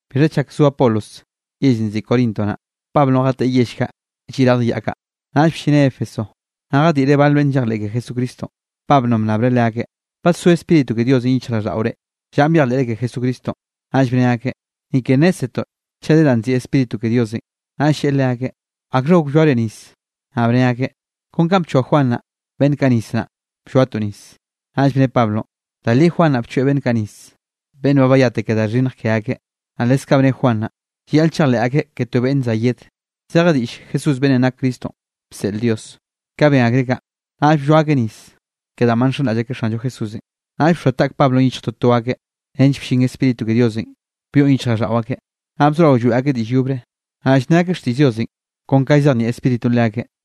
Bixha chak zo Apolos yellenꞌ nziꞌi Corinto naꞌ, Pablonꞌ jateꞌe yell kaꞌ lliꞌ radj yaꞌ kaꞌ. Naꞌll bllineꞌ Éfeso, naꞌ jadiꞌreꞌ bal beꞌnn llejleꞌ ke Jesucristonꞌ. Pablonꞌ bnnabreꞌ leakeꞌ: —¿Badsó Spíritu ke Diosenꞌ yichjraꞌlldaꞌore llanꞌ byejleꞌre ke Jesucristonꞌ? Naꞌll bne akeꞌ: —Ni ke nnézzetoꞌ chaꞌ de da nziꞌi Spíritu ke Diosenꞌ. Naꞌll lleꞌe leakeꞌ: —¿Akxha gok blloare nis? Naꞌ bne akeꞌ: —Kon ka bchoa Juan naꞌ beꞌnn kaꞌ nis naꞌ, blloatoꞌ nis. Naꞌll bne Pablonꞌ: —Da li Juan naꞌ bchoeꞌ beꞌnn kaꞌ nis, beꞌnn ba bayate ke da xhinnj ke akeꞌ, naꞌ leskaꞌ bne Juan naꞌ, llayaꞌl chejleꞌ akeꞌ ke to beꞌnn za yed, zeje diꞌll Jesús beꞌnnenꞌ nak Cristonꞌ bseꞌl Dios. Ka ben akreꞌ kaꞌ, naꞌll blloa akeꞌ nis ke danꞌ ba nxenraꞌll akeꞌ Xanllo Jesúsenꞌ. Naꞌll bxoa taꞌk Pablonꞌ yichj toto akeꞌ, nench bllin Spíritu ke Diosenꞌ byoꞌn yichjraꞌlldaꞌo akeꞌ. Naꞌ bzorao lloeꞌ akeꞌ diꞌll yobre, naꞌ llne akeꞌ xtiꞌll Diosenꞌ kon kanꞌ llzejnieꞌ Spíritunꞌ leakeꞌ.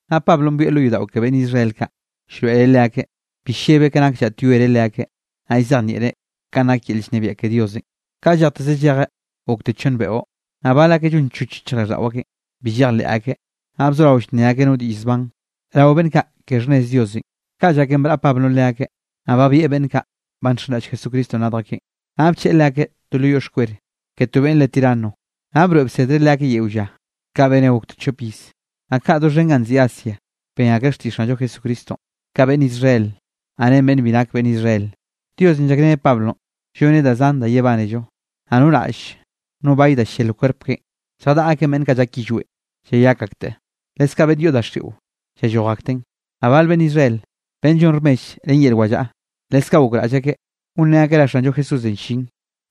Naꞌ Pablonꞌ byoeꞌ lo yodaꞌo ke beꞌnn Israel kaꞌ llroeꞌreꞌ leakeꞌ, bi llebeꞌ ke nak llaꞌtyoereꞌ leakeꞌ, naꞌ llzejnieꞌreꞌ kanꞌ nak yel llnebiaꞌ ke Diosenꞌ. Ka llejteze llejeꞌ gokte chonn beꞌo. Naꞌ bal akeꞌ llonchoch yichjraꞌlldaꞌo akeꞌn, bi llejleꞌ akeꞌ, naꞌ bzorao llnne akeꞌ no diꞌll zban rao beꞌnn kaꞌ ke xhnnez Diosenꞌ. Ka llaken braꞌa Pablonꞌ leakeꞌ, naꞌll babieꞌ beꞌnn kaꞌ ba nxenraꞌll Jesucristonꞌ radj akeꞌn, naꞌ bcheꞌe leakeꞌ to lo yoꞌ xkwel ke to beꞌnn re Tirano, naꞌ broeꞌ bsedreꞌ leakeꞌ yeo lla. Ka beneꞌ gokte chop iz, naꞌ kaꞌ doxhen ganꞌ nziꞌi Asia ben akreꞌ xtiꞌll Xanllo Jesucristonꞌ, ka beꞌnn Israel, naꞌ ren beꞌnn bi nak beꞌnn Israel. Diosenꞌ llakreneꞌ Pablonꞌ lloneꞌ da zan da yebánello. Naꞌ no raꞌll no bay da ll-llel kwerp keꞌen, lljadaꞌa akeꞌn beꞌnn kaꞌ llak yillweꞌn llayak akteꞌ, leskaꞌ beꞌnn yoꞌ daxiꞌo llalloj akten. Naꞌ bal beꞌnn Israel beꞌnn llon rmell ren yel wallaꞌa, leskaꞌ gokraꞌll akeꞌ gonrén akeꞌ ra Xanllo Jesúsenꞌ llin,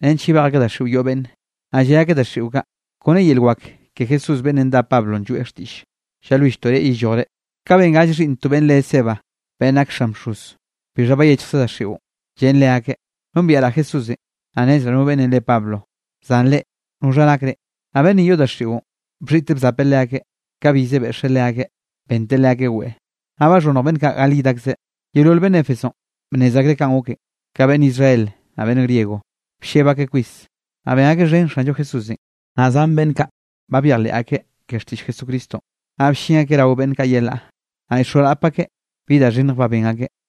nench yebej akeꞌ daxiꞌo yoꞌ beꞌnne, naꞌ lle akeꞌ daxiꞌo kaꞌ: —Kon ren yel wak ke Jesús beꞌnnenꞌ dá Pablonꞌ lloeꞌ xtiꞌll, llalwilltoꞌ reꞌ yellojre. Kaꞌ ben gall xhiꞌnn to beꞌnn re Esceva beꞌnn nak xan bxoz. Bixha bayechjkze daxiꞌon, llen leakeꞌ: —Nombieꞌraꞌ Jesúsenꞌ, naꞌ nnezraꞌ no beꞌnnenꞌ re Pablo, zan reꞌ, ¿noxha nak reꞌ? Naꞌ beꞌnnenꞌ yoꞌ daxiꞌon, bxhiꞌteꞌ bzapeꞌ leakeꞌ, ka bize beꞌxeꞌ leakeꞌ benteꞌ leakeꞌ weꞌe, naꞌ baxhonnj beꞌnn kaꞌ gal yid akzeꞌ. Yeolol beꞌnn Éfesonꞌ bnnez akreꞌ kanꞌ goken, ka beꞌnn Israel naꞌ beꞌnn griego, blleb akeꞌ kwis, naꞌ ben akeꞌ xhen Xanllo Jesúsenꞌ. Naꞌ zan beꞌnn kaꞌ ba byejleꞌ akeꞌ ke xtiꞌll Jesucristonꞌ, naꞌ bllin akeꞌ rao beꞌnn kaꞌ yelaꞌ, naꞌ llxoarap akeꞌ bi da xhinnj ba ben akeꞌ.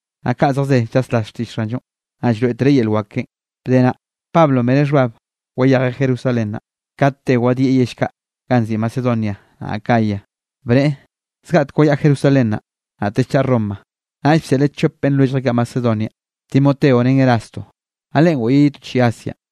Naꞌ ka zejze llaslas xtiꞌll Xanllonꞌ, naꞌ llroeꞌtereꞌ yel wak keꞌen. Bde naꞌ, Pablonꞌ bene xhbab wayejeꞌ Jerusalén naꞌ, kat te wadieꞌ yell kaꞌ ganꞌ nziꞌi Macedonia naꞌ Acaya, bneꞌe: —Zgaꞌtek wayaꞌa Jerusalén naꞌ, naꞌtell chaꞌa Roma. Naꞌll bseꞌleꞌ chop beꞌnn lwelljeꞌ kaꞌ Macedonia, Timoteo ren Erasto, naꞌ leꞌen goꞌyeꞌ ye to chiꞌi Asianꞌ.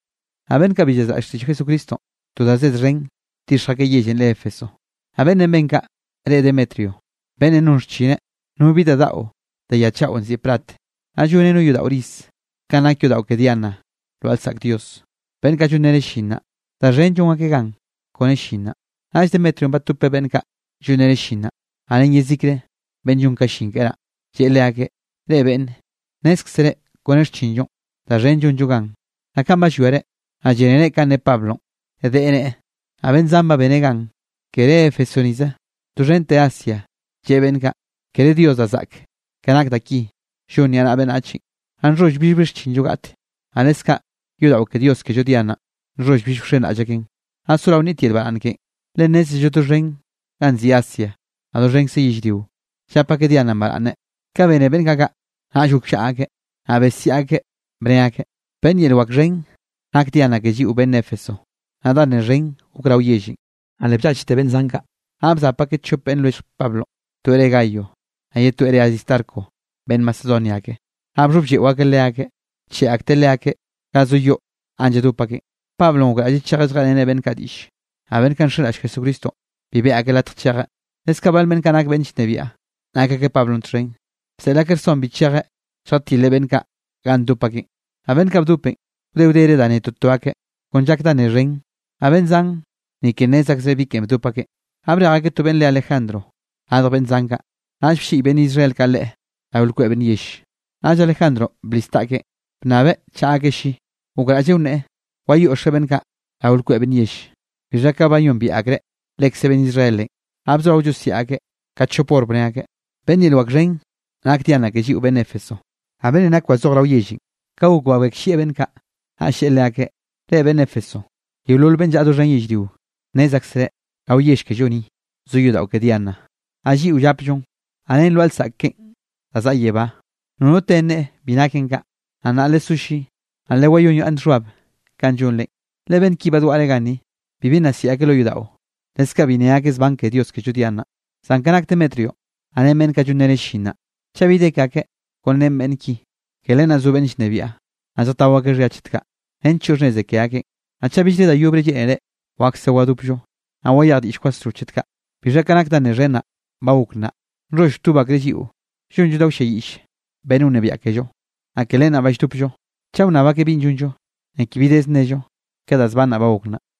Naꞌ beꞌnn kaꞌ bi llazraꞌll xtiꞌll Jesucristonꞌ, to da zed xhen bdixj akeꞌ yellenꞌ re Éfeso. Naꞌ beꞌnnenꞌ ben kaꞌ re Demetrio, beꞌnnenꞌ non xchineꞌ no bi da daꞌo de ya chaꞌo nziꞌi plat, naꞌ lloneꞌ no yodaꞌo riz kanꞌ nak yodaꞌo ke Diana lwaꞌa lsaꞌk dios. Beꞌnn kaꞌ llonreneꞌ llin naꞌ, da xhen llon akeꞌ gan kone llin naꞌ. Naꞌll Demetrionꞌ batopeꞌ beꞌnn kaꞌ llonreneꞌ llin naꞌ, naꞌ ren yezikre beꞌnn llon ka llin keꞌe naꞌ, lleꞌe leakeꞌ: —Reꞌ beꞌnne, nnézkzere kone xchinllonꞌ, da xhen llonllo gan. Naꞌ kanꞌ ba llwiare, naꞌ llénere kanꞌ ne Pablonꞌ, deꞌe neꞌe, naꞌ beꞌnn zan ba beneꞌ gan, kere Éfeso nize, doxhente Asia, lleꞌe beꞌnn kaꞌ: “Kere dios da zaꞌk ke nak da ki llon niaꞌnaꞌa beꞌnnachenꞌ.” Naꞌ nxholl billbi xchinllo gaꞌte, naꞌ leskaꞌ yodaꞌo ke dios kello Diananꞌ, nxholl bill wxenraꞌll akeꞌn, naꞌ sorao nnit yel baraꞌnn keꞌen, le nnézello doxhen ganꞌ nziꞌi Asia, naꞌ doxhenkze yellrio, llap akeꞌ Diananꞌ baraꞌnne. Ka bene beꞌnn kaꞌ kaꞌ, naꞌll gokllaꞌa akeꞌ, naꞌ besiaꞌ akeꞌ bne akeꞌ: —¡Beꞌnn yel wak xhen nak Diana ke lliꞌo beꞌnn Éfeso! Naꞌ da nne xhen gok rao yellenꞌ, naꞌ le bllachte beꞌnn zan kaꞌ, naꞌ bzap akeꞌ chop beꞌnn lwellj Pablonꞌ, toeꞌ reꞌe Gayo, naꞌ ye toeꞌ reꞌe Aristarco beꞌnn Macedonia ake. Naꞌ bxhoblleꞌo akeꞌ leakeꞌ, bcheꞌe akteꞌ leakeꞌ ga zo yoꞌ ganꞌ lladop akeꞌn. Pablonꞌ gokraꞌlleꞌ chejeꞌ lljeꞌreneꞌ beꞌnn kaꞌ diꞌlle, naꞌ beꞌnn kaꞌ nxenraꞌll Jesucristonꞌ bi beꞌe akeꞌ latj chejeꞌ. Leskaꞌ bal beꞌnn kaꞌ nak beꞌnn llnebiaꞌ nak akeꞌ Pablonꞌ txhen naꞌ, bseꞌl akeꞌ rson bi chejeꞌ lljatileꞌ beꞌnn kaꞌ ganꞌ ndop akeꞌn. Naꞌ beꞌnn kaꞌ bdopenꞌ, wde wdere da ne toto akeꞌ kon llak da nne xhen, naꞌ beꞌnn zan, ni ke nnez akzreꞌ bi ken bdop akeꞌ. Naꞌ brej akeꞌ to beꞌnn re Alejandro radj beꞌnn zan kaꞌ, naꞌll blliꞌy beꞌnn Israel kaꞌ leꞌe rao lkweꞌ beꞌnn yell. Naꞌll Alejandro blis taꞌkeꞌ bnnabeꞌ chaꞌa akeꞌ lli, gokraꞌlleꞌ wneꞌe, wayoꞌxeꞌ beꞌnn kaꞌ rao lkweꞌ beꞌnn yell. Bixha ka bayombiaꞌ akreꞌ lekze beꞌnn Israelenꞌ, naꞌ bzorao llosiaꞌ akeꞌ ka chop hor, bne akeꞌ: —¡Beꞌnn yel wak xhen nak Diana ke lliꞌo beꞌnn Éfeso! Naꞌ beꞌnnenꞌ nake wazoje rao yellenꞌ, ka gok babekllieꞌ beꞌnn kaꞌ, naꞌll lleꞌe leakeꞌ: —Reꞌ beꞌnn Éfeso, yeolol beꞌnn llaꞌa doxhen yellrionꞌ, nnez aksereꞌ rao yell kello ni zo yodaꞌo ke Diana, naꞌ lliꞌo llapllon, naꞌ ren lwaꞌa lsaꞌk keꞌen da zaꞌa yebá. Nono te nneꞌe bi naken kaꞌ, naꞌ nnaꞌ lesó lli, naꞌ lewayonyaꞌnn xhbab kanꞌ llonrenꞌ. Le beꞌnn ki badwaꞌre ganni, bibi nna siꞌi akeꞌ lo yodaꞌo, leskaꞌ bi nne akeꞌ zban ke dios kello Diananꞌ. Zan ka nak Demetrionꞌ naꞌ ren beꞌnn kaꞌ llonreneꞌ llin naꞌ, chaꞌ bi de ke akeꞌ kon ren beꞌnn ki, ke len naꞌ zo beꞌnn llnebiaꞌ, naꞌ lljatao akeꞌ xhia chet kaꞌ, nench choꞌ xhnneze ke akeꞌn. Naꞌ chaꞌ billre da yobrenꞌ lleꞌnere, wakse wadopllo, naꞌ wayej diꞌll kwasro chet kaꞌ. Bixha ka nak da nne xhen naꞌ, ba gok nnaꞌ, nxholl wtob akreꞌ lliꞌo llonllo da wlliayiꞌll beꞌnn wnebiaꞌ kello, naꞌ ke len naꞌ ba lldopllo. Chaꞌ wnnab akeꞌ binꞌ llonllo, ni ke bi dez nnello ke da zban naꞌ ba gok nnaꞌ.